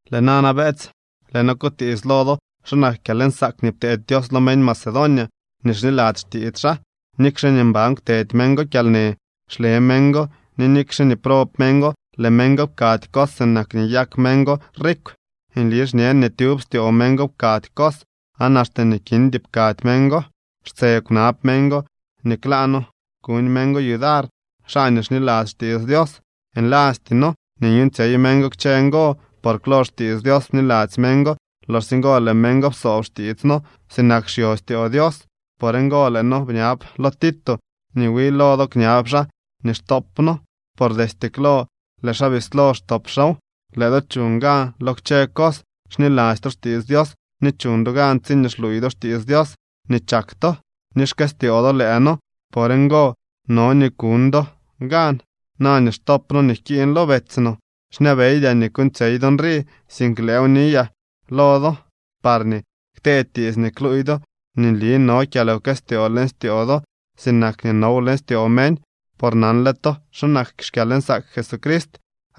Lëë nana, beetsy, lëë noo kutiits lo do xa nak kyalnsaak nii pteedy Dios lo meñ Macedonia nii xniladzy xtiits xaa. Nikxe nii mban kwtedy meñ go kyalnë, xle meñ go, ni nikxe nii prob meñ go, lëë meñ go pkady cos sinak nii nyak meñ go rikw. Nli xñen nii tyub styoo meñ go pkady cos aan axte nii kindy pkady meñ go. Xtse kwnab meñ go nii klaa noo kuñ meñ go yudar xaa nii xniladzy xtiits Dios. Nlasty noo nii nyuuñtsyey meñ go kchë ngo, por klo xtiits Dios bniladzy meñ go. Loxsye ngo lëë meñ go psoob xtiits noo sinak xyo styoo Dios. Por ngo lëë noo bñab lo Tito nii wi lo do kñab xaa nii xtop noo, por destye klo lëë xaa bislo xtop xaaw. Lëë do chuñ gan lo kchë cos, xniladzy to xtiits Dios, ni chuñ do gan tsiñee xluuy do xtiits Dios, ni chak to, ni xkëstyoo do lëë noo. Por ngo no nii kuñ do gan na nii xtop noo nii jkiiñ lo betsy no. Xñabeydyaa nii kuuñtsyey do nrii, sink lëëw niyaa lo do parñee ktee tiits nii kluuy do nii nli no kyalwkëstyoo leñ styoo do sinak nii now leñ styoo meñ. Por nanle to xa nak xkyalnsaak Jesucrist.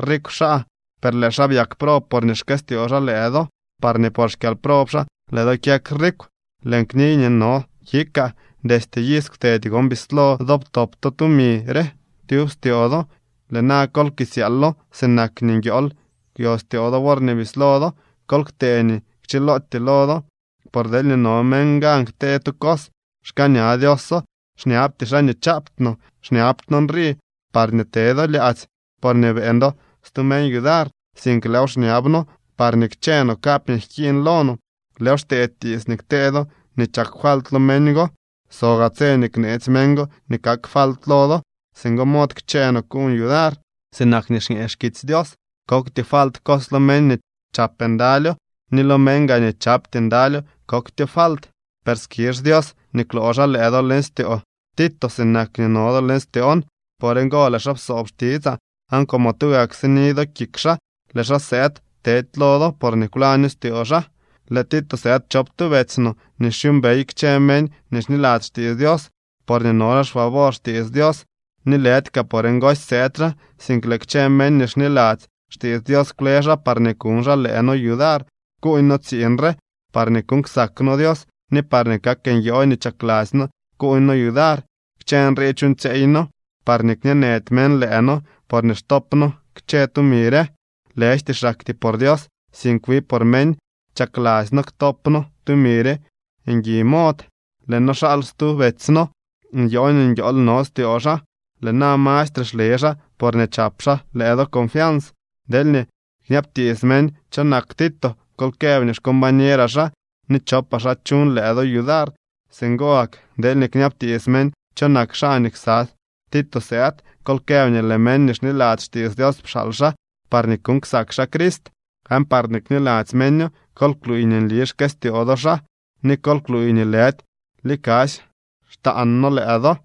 Rikw xaa, per lëë xaa byak prob porñee xkëstyoo xaa lëë do, parñee por xkyalprob xaa lëë do kyak rikw. Lëën kniy nii no kikaa. Destye iz kwtedy gon bislo do ptop to tumi re tyub styoo do. Lëë na kol kisyaalo sinak nii nguiool kwyo styoo do worñee bislo do. Kol ktee nii kchilootyee lo do. Por deelñee no meñ gan ktee tu cos, xkaaña Dioso. Xñabty xaa nii chaapty no. Xñabty noo nrii parñee te do lyaadzy porñee beeñ do stu meñ yudar, sink lëëw xñab noo parñee kchë no kap nii jkiiñ lo no. Lëëw xtee tiits nii ktee do nii chak falt lo meñ go, so gaa tse nii kneetsy meñ go nii kak falt lo do. Singo mod kchë no kuuñ yudar, sinak nii xñee xkitsy Dios: “Kokty falt cos lo meñ nii chap ndalyo, ni lo meñ gaa nii chapty ndalyo koktyo falt.” Per skizh Dios nii kwloo xaa lëë do leñ styoo Tito sinak nii no do leñ styoon. Por ngo lëë xaa psoob xtitsaa, aan como tugak sini do kik xaa, lëë xaa sëëd tedy lo do porñee kwlaño styoo xaa. Lëë Tito sëëd chop tu betsy no nii xyuumbey kchë meñ nii xniladzy xtiits Dios, porñee no xaa xfavor xtiits Dios. Ni lëdy kaa por ngosy sëëd xaa, sink lëë kchë meñ nii xniladzy xtiits Dios kwle xaa parñee kuñ xaa lëë noo yudar kuuñ noo tsiiñ re parñee kuuñ ksak noo Dios ni parñee kak nyoo nii chakladzy noo kuuñ noo yudar. Kchë nrii chuuñtsyeey noo parñee kñeenëdy meñ lëë noo porñee xtop noo kchë tumi re. Lëjty xaktyee por Dios, sink wi por meñ, chakladzy noo ktop noo tumi re ngui mod. Lëë noo xaal stu betsy no. Nyoo nii nguiool no styoo xaa. Lëë na mastre xle xaa porñee chap xaa lëë do confians. Deelñee kñabtiits meñ cho nak Tito, kol këb nii xcombañeraa xaa ni chopaa xaa chuñ lëë do yudar. Singo gak deelñee kñabtiits meñ cho nak xaa nii ksa Tito sëëd, kol këb nii lëë meñ nii xniladzy xtiits Dios pxaal xaa parñee kuuñ ksak xaa Crist. Aan parñee kniladzy meño, kol kluuy nii nli xkëstyoo do xaa, ni kol kluuy nii lëdy likasy xtaan noo lëë do.